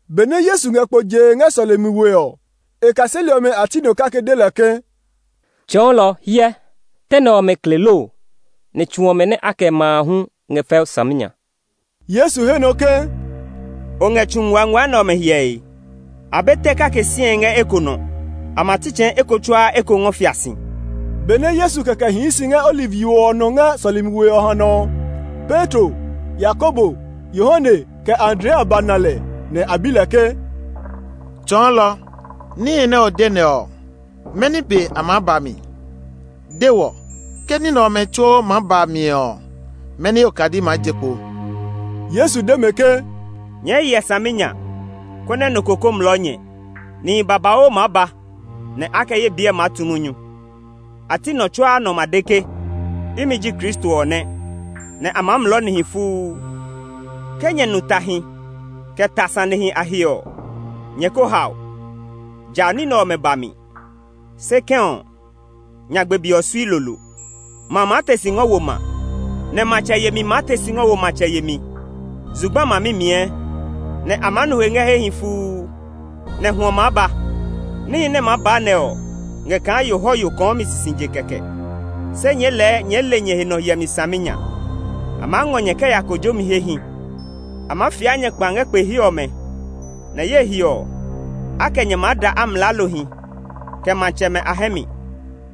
Benɛ Yesu ngɛ kpo jee ngɛ sɔlemi we ɔ, e kaseli ɔmɛ a ti nɔ kake de lɛ ke, “Tsɔɔlɔ, hyɛ, tɛ nɛ ɔmɛ kle loo, nɛ tsu ɔmɛ nɛ a kɛ ma a hu ngɛ fɛu saminya.” Yesu he nɔ ke, “O ngɛ tsu nguangua nɛ ɔmɛ hyɛe? A be tɛ kake sie ngɛ eko nɔ; a ma tsitsɛɛ eko tsuaa eko ngɔ fia si!” Benɛ Yesu kɛkɛ hii si ngɛ Oliv yo ɔ nɔ ngɛ sɔlemi we ɔ hanɔ ɔ, Petro, Yakobo, Yohane, kɛ Andrea ba na lɛ, nɛ a bi lɛ ke, “Tsɔɔlɔ, níhi nɛ o de nɛ ɔ, mɛni be a maa ba mi? De wɔ! Ke ní nɛ ɔmɛ tsuo maa ba mi ɔ, mɛni okadi maa je kpo?” Yesu de mɛ ke, “Nyɛɛ hyɛ saminya, konɛ nɔ ko kó mlɔɔ nyɛ! Nihi babauu maa ba nɛ a kɛ ye biɛ maa tu munyu; a ti nɔ tsuaa nɔ ma de ke, ‘Imi ji Kristo ɔ nɛ!’ Nɛ a maa mlɔɔ nihi fuu. Ke nyɛ nu tahi, kɛ ta sanehi a he ɔ, nyɛ ko hao. Ja ní nɛ ɔmɛ ba mi, se kɛ̃ ɔ, nyagbe be ɔ sui lolo. Ma maa te si ngɔ wo ma; nɛ matsɛ yemi maa te si ngɔ wo matsɛ yemi. Zugba ma mimiɛ, nɛ a maa nu he ngɛ hehi fuu; nɛ hwɔ maa ba. Níhi nɛ maa ba nɛ ɔ ngɛ kaa yohɔyo kɔɔmi sisije kɛkɛ. “Se nyɛɛ lɛɛ nyɛɛ le nyɛ he nɔ hyɛmi saminya. A maa ngɔ nyɛ kɛ ya kojomi hehi. A maa fia nyɛ kpa ngɛ kpe he ɔmɛ, nɛ ye he ɔ, a kɛ nyɛ maa da amlaalohi, kɛ matsɛmɛ a hɛ mi,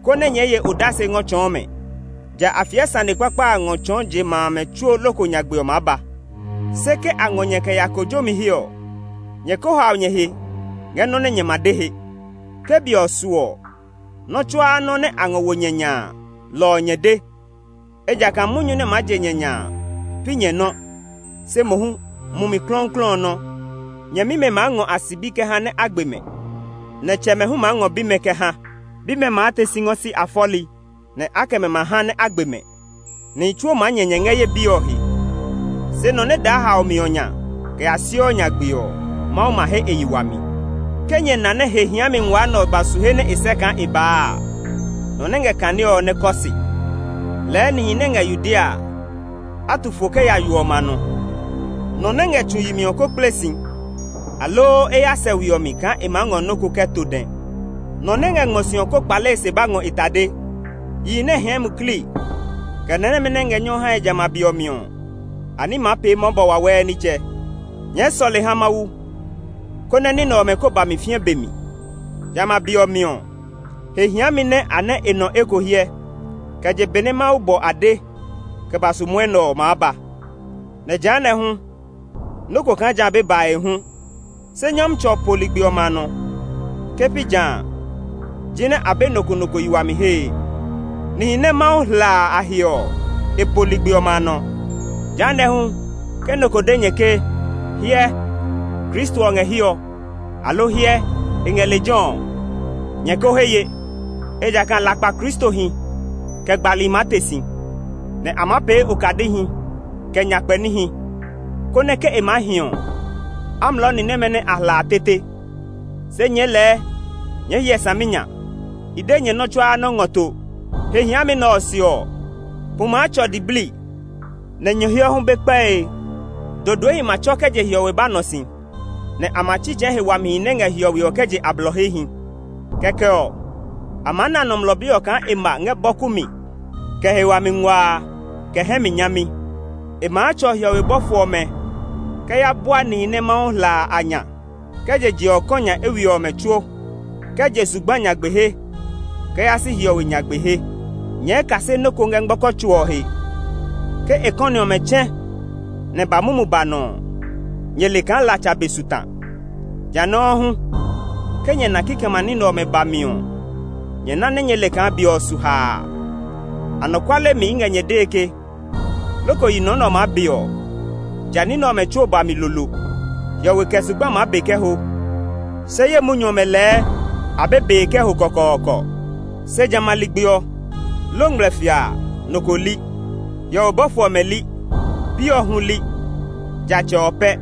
konɛ nyɛɛ ye odase ngɔ tsɔɔ mɛ. Ja a fiɛ sane kpakpa a ngɔ tsɔɔ je ma amɛ tsuo loko nyagbe ɔ maa ba. Se ke a ngɔ nyɛ kɛ ya kojomi he ɔ, nyɛ ko hao nyɛ he ngɛ nɔ́ nɛ nyɛ ma de he. Ke be ɔ su ɔ, nɔ́ tsuaa nɔ́ nɛ a ngɔ wo nyɛ nya a, lɔ ɔ nyɛ de. Ejakaa munyu nɛ maa je nyɛ nya a, pi nyɛ nɔ́, se mohu Mumi Klɔuklɔu ɔ nɔ́. Nyɛmimɛ maa ngɔ a sibi kɛ ha nɛ a gbe mɛ, nɛ tsɛmɛ hu maa ngɔ bimɛ kɛ ha. Bimɛ maa te si ngɔ si a fɔli, nɛ a kɛ mɛ ma ha nɛ a gbe mɛ. Nihi tsuo maa nyɛ nyɛ ngɛ ye biɛ ɔ he; se nɔ nɛ daa haomi ɔ nya kɛ ya siɔ nyagbe ɔ, Mawu ma he e yi wami. “Ke nyɛ na nɛ ‘He hiami ngua a’ nɛ ɔ ba su he nɛ e sɛ́ kaa e baa a (nɔ nɛ ngɛ kanee ɔ nɛ kɔ se), lɛɛ nihi nɛ ngɛ Yudea a, a tu fo kɛ ya yo ɔmɛ a nɔ. Nɔ nɛ ngɛ tsu yi mi ɔ kó kple si, aloo ya sɛ we ɔ mi kaa e maa ngɔ nɔ́ ko kɛ to dɛ. Nɔ nɛ ngɛ ngmɔ si ɔ kó kpale e se ba ngɔ e tade. Yihi nɛ hɛɛ muklii, kɛ ni nɛmɛ nɛ ngɛ nyɔ hae ngɛ jamɛ a be ɔ mi ɔ, a ní maa pee mɔbɔ wawɛɛ nitsɛ. Nyɛɛ sɔle ha Mawu, konɛ ní nɛ ɔmɛ kó ba mi fĩɛ be mi. Jamɛ a be ɔ mi ɔ, he hiami nɛ a nɛ́ e nɔ eko hyɛ kɛ je benɛ Mawu bɔ ade kɛ ba su mwɔnɛ ɔ maa ba, nɛ jehanɛ hu, nɔ́ ko kaa jã be bae hu. Se Nyɔmtsɛ ɔ po ligbi ɔmɛ a nɔ; ke pi jã a, jinɛ a be nɔ ko nɔ ko yi wami hee. Nihi nɛ Mawu hla a a he ɔ, e po ligbi ɔmɛ a nɔ. “Jehanɛ hu ke nɔ ko de nyɛ ke, ‘Hyɛ, Kristo ɔ ngɛ hiɛ ɔ!’ aloo ‘Hyɛ, e ngɛ lejɛ ɔ!’ ɔ, nyɛ ko he ye. Ejakaa lakpa kristohi, kɛ gbali maa te si, nɛ a maa pee okadihi, kɛ nyakpɛ níhi, konɛ ke e maa hi ɔ, a mlɔɔ ni nɛmɛ nɛ a hla a tete. Se nyɛɛ lɛɛ nyɛɛ hyɛ saminya! I de nyɛ nɔ́ tsuaa nɔ́ ngɔ to. “He hiami nɛ ɔ se ɔ, pu maa tsɔ diblii, nɛ nyɔhiɔ hu be kpɛe. Dodoehi ma tsɔ kɛ je hiɔwe ba nɔ si, nɛ a ma tsitsɛɛ he wamihi nɛ ngɛ hiɔwe ɔ kɛ je a blɔ hehi. Kɛkɛ ɔ, a maa na Nɔmlɔ Bi ɔ kaa e ma ngɛ bɔku mi kɛ he wami nguaa, kɛ hɛ mi nyami. E maa tsɔ hiɔwe bɔfo ɔmɛ kɛ ya bua nihi nɛ Mawu hla a a nya kɛ je je ɔ kɔ nya eywiɛ ɔmɛ tsuo, kɛ je zugba nyagbe he kɛ yaa si hiɔwe nyagbe he. “Nyɛɛ kase nɔ́ ko ngɛ ngmɔkɔ tso ɔ he; ke e kɔni ɔmɛ tsɛ̃ nɛ ba mumu ba nɔ ɔ, nyɛ le kaa latsa be su ta. Ja nɔuu hu ke nyɛ na nɛ kikɛmɛ a ní nɛ ɔmɛ ba mi ɔ, nyɛ na nɛ nyɛɛ le kaa be ɔ su haa. Anɔkuale mi i ngɛ nyɛ dee ke, loko yi nɔ nɛ ɔ maa be ɔ, ja ní nɛ ɔmɛ tsuo ba mi lolo. Hiɔwe kɛ zugba maa be kɛ ho, se ye munyu ɔmɛ lɛɛ a be bee kɛ ho kɔkɔɔkɔ. “Se jamɛ a ligbi ɔ, loo ngmlɛfia a, nɔ ko li; hiɔwe bɔfo ɔmɛ li, Bi ɔ hu li, ja Tsɛ ɔ pɛ.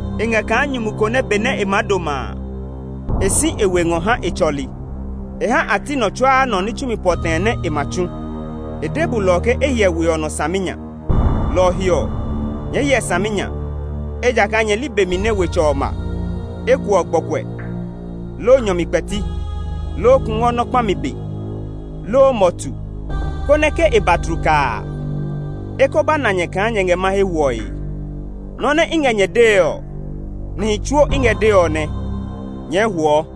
E ngɛ kaa nyumu ko nɛ benɛ e maa doma a, e si e we ngɔ ha e tsɔli. E ha a ti nɔ tsuaa nɔ ní tsumi pɔtɛɛ nɛ e ma tsu. E de bulɔ ɔ ke e hyɛ we ɔ nɔ saminya. Lɔ ɔ he ɔ, nyɛɛ hyɛ saminya, ejakaa nyɛ li be mi nɛ wetsɛ ɔ ma; eko ɔ gbɔkuɛ, loo nyɔ mi kpɛti, loo kungwɔ nɔ kpami be, loo mɔtu, konɛ ke e ba tlukaa a, e kó ba na nyɛ kaa nyɛ ngɛ mahe hwɔe. Nɔ́ nɛ i ngɛ nyɛ dee ɔ, nihi tsuo i ngɛ dee ɔ nɛ. Nyɛɛ huɔ!”